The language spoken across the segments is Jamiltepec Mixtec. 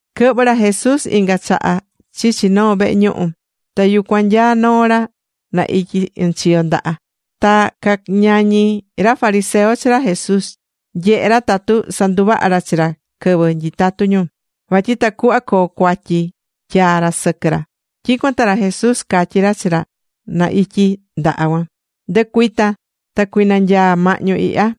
Quɨhvɨ̱ ra Jesús inga chaha chichi noo vehe ñuhu. Ta yucuan nyaá noo ra na ityi ɨnchiyo ndaha. Ta cañañí ra fariseo chi ra Jesús nyehé ra tatu sanduvaha ra chi ra quɨvɨ nyitatú ñu, vatyi tacuhva coo cuatyi tyaa ra sɨquɨ ra. Tyicuan ta ra Jesús catyí ra chi ra na ityi ndaha cuan: ―Ndɨ̱cuita ta cui̱nanyaa mahñu ihya.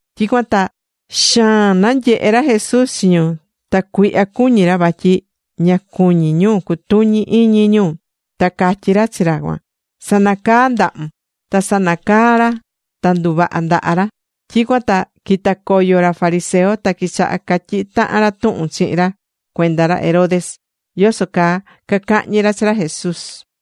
Tyicuan ta xaan nanyehe ra Jesús chi ñu, ta cuihya cuñí ra vatyi ña cuñí ñu cutuñi iñi ñu. Ta catyí ra chi ra cuan: ―Sa̱nacaa ndahun. Ta sanacaa̱ ra, ta nduvaha̱ ndaha ra. Tyicuan ta quita̱ coyo ra fariseo, ta quichaha̱ catyihi tahan ra tuhun chihin ra cuenda ra Herodes, yoso caa cacahñi ra chi ra Jesús.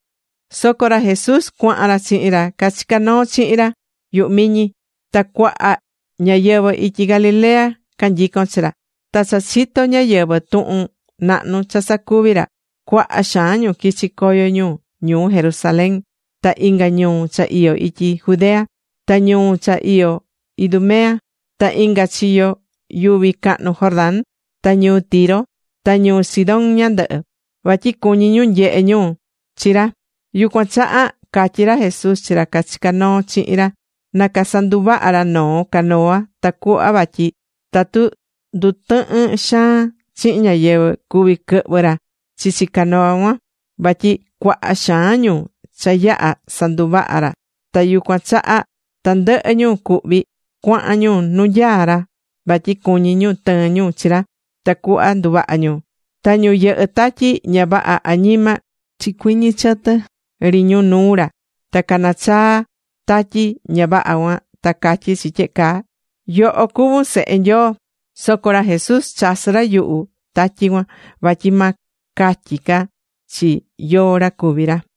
Soco ra Jesús cuahan ra chihin ra cachicá noo chihin ra yuhu miñi, ta cuaha ñáyɨvɨ ityi Galilea canyicón chi ra. Ta cha chito̱ ñáyɨvɨ tuhun nahnu cha sacuví ra, cuaha xaan ñu quichi̱ coyo ñu ñuu Jerusalén ta inga ñuu cha iyó ityi Judea, ta ñuu cha iyó Idumea, ta inga chiyo yuvi cahnu Jordán, ta ñuu Tiro ta ñuu Sidón ñandɨhɨ, vatyi cuñí ñu nyehe ñu chi ra. Yucuan chaha catyí ra Jesús chi ra cachicá noo chihin ra na casanduvaha ra noo canoa, tacuhva vatyi tatu ndutɨhɨn xaan chihin ñáyɨvɨ, cuví quɨhvɨ ra chichi canoa cuan. Vatyi cuaha xaan ñu cha yaha̱ sanduvaha̱ ra, ta yucuan chaha tandɨhɨ ñu cuhví cuahan ñu nu nyaá ra vatyi cuñí ñu tɨɨn ñu chi ra tacuhva nduvaha ñu. Ta ñu yɨhɨ́ tatyi ña vaha añima, chicuiñi chɨtɨ ri ñu nuu ra, ta canachaa tatyi ña vaha cuan, ta catyí chi tyehe caa: ―¡Yoho cuvún Sehe Nyoo! Soco ra Jesús chasɨ̱ ra yuhu tatyi cuan vatyi ma catyi ca chi yóó ra cuví ra.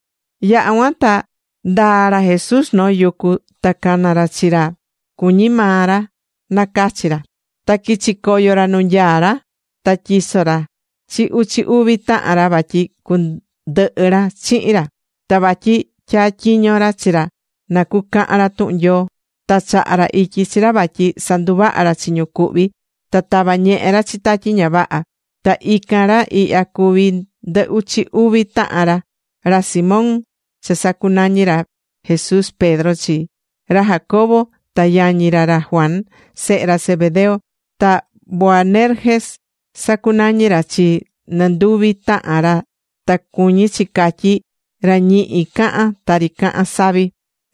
Yaha̱ cuan ta ndaa̱ ra Jesús noo yucu ta cana̱ ra chi ra cuñí maa ra nacachi ra. Ta quichi̱ coyo ra nu nyaá ra. Ta tyiso̱ ra chi uchi uvi tahan ra vatyi cundɨhɨ ra chihin ra, ta vatyi tyatyiño ra chi ra na cucahan ra tuhun Nyoo. Ta chaha̱ ra ityi chi ra vatyi sanduvaha ra chi ñu cuhví, ta tava ñehe ra chi tatyi ña vaha. Ta ican ra ihya cacuví ndɨ uchi uvi tahan ra: ra Simón cha sacunañi̱ ra Jesús Pedro chi; ra Jacobo ta yañi ra ra Juan, sehe ra Zebedeo. Ta Boanerges sacunañi̱ ra chi nɨnduvi tahan ra ta cuñí chi catyi: ra ñihi cahán tari cahán savi,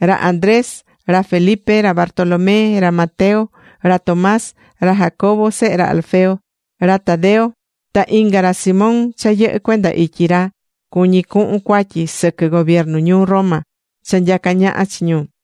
ra Andrés, ra Felipe, ra Bartolomé, ra Mateo, ra Tomás, ra Jacobo sehe ra Alfeo, ra Tadeo, ta inga ra Simón cha yɨhɨ́ cuenda ityi ra cuñí cuhun cuatyi sɨquɨ gobiernu ñuu Roma cha nyacá ñaha chi ñu,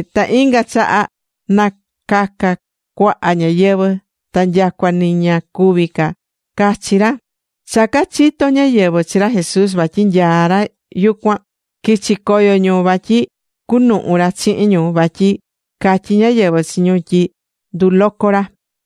Ta inga chaha nataca̱ cuaha ñáyɨvɨ, ta nyacua ni ña cuví ca cachi ra. Cha cachito̱ ñáyɨvɨ chi ra Jesús vatyi nyaá ra yucuan, quichi̱ coyo ñu vatyi cunuhun ra chihin ñu, vatyi catyi̱ ñáyɨvɨ chi ñu tyi nduloco ra.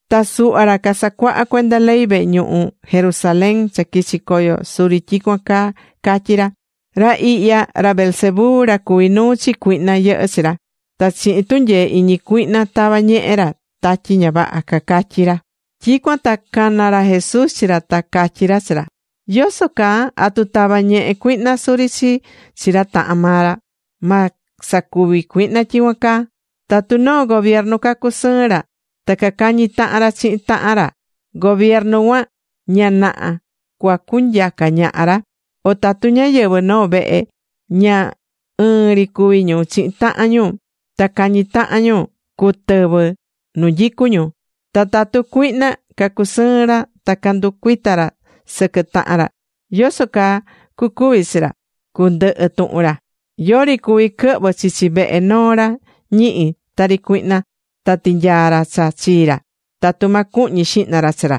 Ta suhva ra casacuahá cuenda ley vehe ñuhu Jerusalén cha quichi̱ coyo suri tyicuan caa cacatyí ra: ―Ra ihya, ra Beelzebú ra cuví nuu chi cuihna yɨhɨ́ chi ra. Ta chihin tunyee iñi cuihna tava ñehe ra tatyi ña vaha ―cacatyí ra. Tyicuan ta cana̱ ra Jesús chi ra, ta catyí ra chi ra: ―¿Yoso caa, atu tavá ñehe cuihna suri chi ra tahan maa ra? Ma sacuvi cuihna tyicuan caa. Tatu noo gobiernu cacusɨɨn ra, ta cacañí tahan ra chihin tahan ra, gobiernu cuan ña naha cuacunyaca ñaha ra. O tatu ñáyɨvɨ noo vehe, ña ɨɨn ri cuví ñu chihin tahan ñu ta cañi tahan ñu, cutɨvɨ nu nyicú ñu. Ta tatu cuihna cacusɨɨn ra ta canducuita ra sɨquɨ tahan ra, ¿yoso caa cucuvi chi ra? Cundɨhɨ tuhun ra. ’Yori cuví quɨhvɨ chichi vehe noo ra ñihi tari cuihna ta tinyaa ra cha chii ra, tatu ma cuhñi xihna ra chi ra.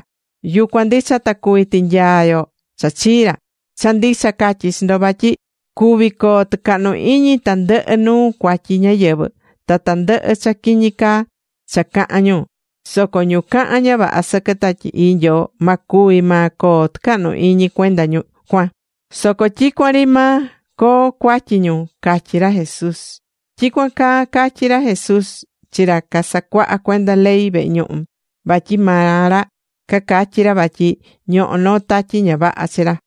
Yucuan ndicha ta cuví tinyaa yo cha chii ra. ’Cha ndicha catyí chi ndo vatyi cuví coo tɨcahnu iñi tandɨhɨ nuu cuatyi ñáyɨvɨ, ta tandɨhɨ cha quiñi caa cha cahán ñu. Soco ñu cahán ña vaha sɨquɨ Tatyi Ii Nyoo, ma cuvi maa coo tɨcahnu iñi cuenda cuan, soco tyicuan ri maa coo cuatyi ñu ―catyí ra Jesús. Tyicuan caa catyi̱ ra Jesús chi ra casacuahá cuenda ley vehe ñuhu, vatyi maa ra cacatyi ra vatyi ñohó noo tatyi ña vaha chi ra.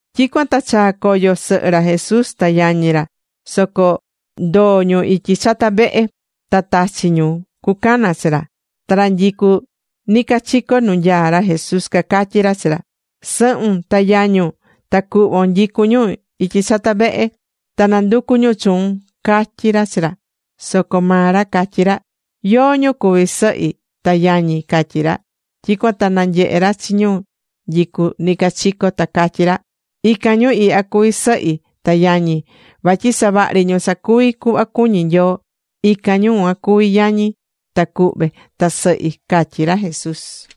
Tyicuan ta chaa̱ coyo sɨhɨ ra Jesús ta yañi ra, soco ndoo̱ ñu ityi chata vehe, ta tachi̱ ñu cucana chi ra. Ta ra nyicú nicachico nu nyaá ra Jesús cacatyí ra chi ra: ―Sɨhun ta yañun ta cuhvon nyicú ñu ityi chata vehe, ta nanducú ñu chuun ―catyí ra chi ra. Soco maa ra catyí ra: ―¿Yóó ñu cuví sɨhi ta yañi? ―catyí ra. Tyicuan ta nanyehe̱ ra chi ñu nyicú nicachico, ta catyí ra: ―Ican ñu ihya cuví sɨhi ta yañi. Vatyi savahri ñu sacuví cuhva cuñí Nyoo, ican ñu cuan cuví yañi, ta cuhve, ta sɨhi ―catyí ra Jesús.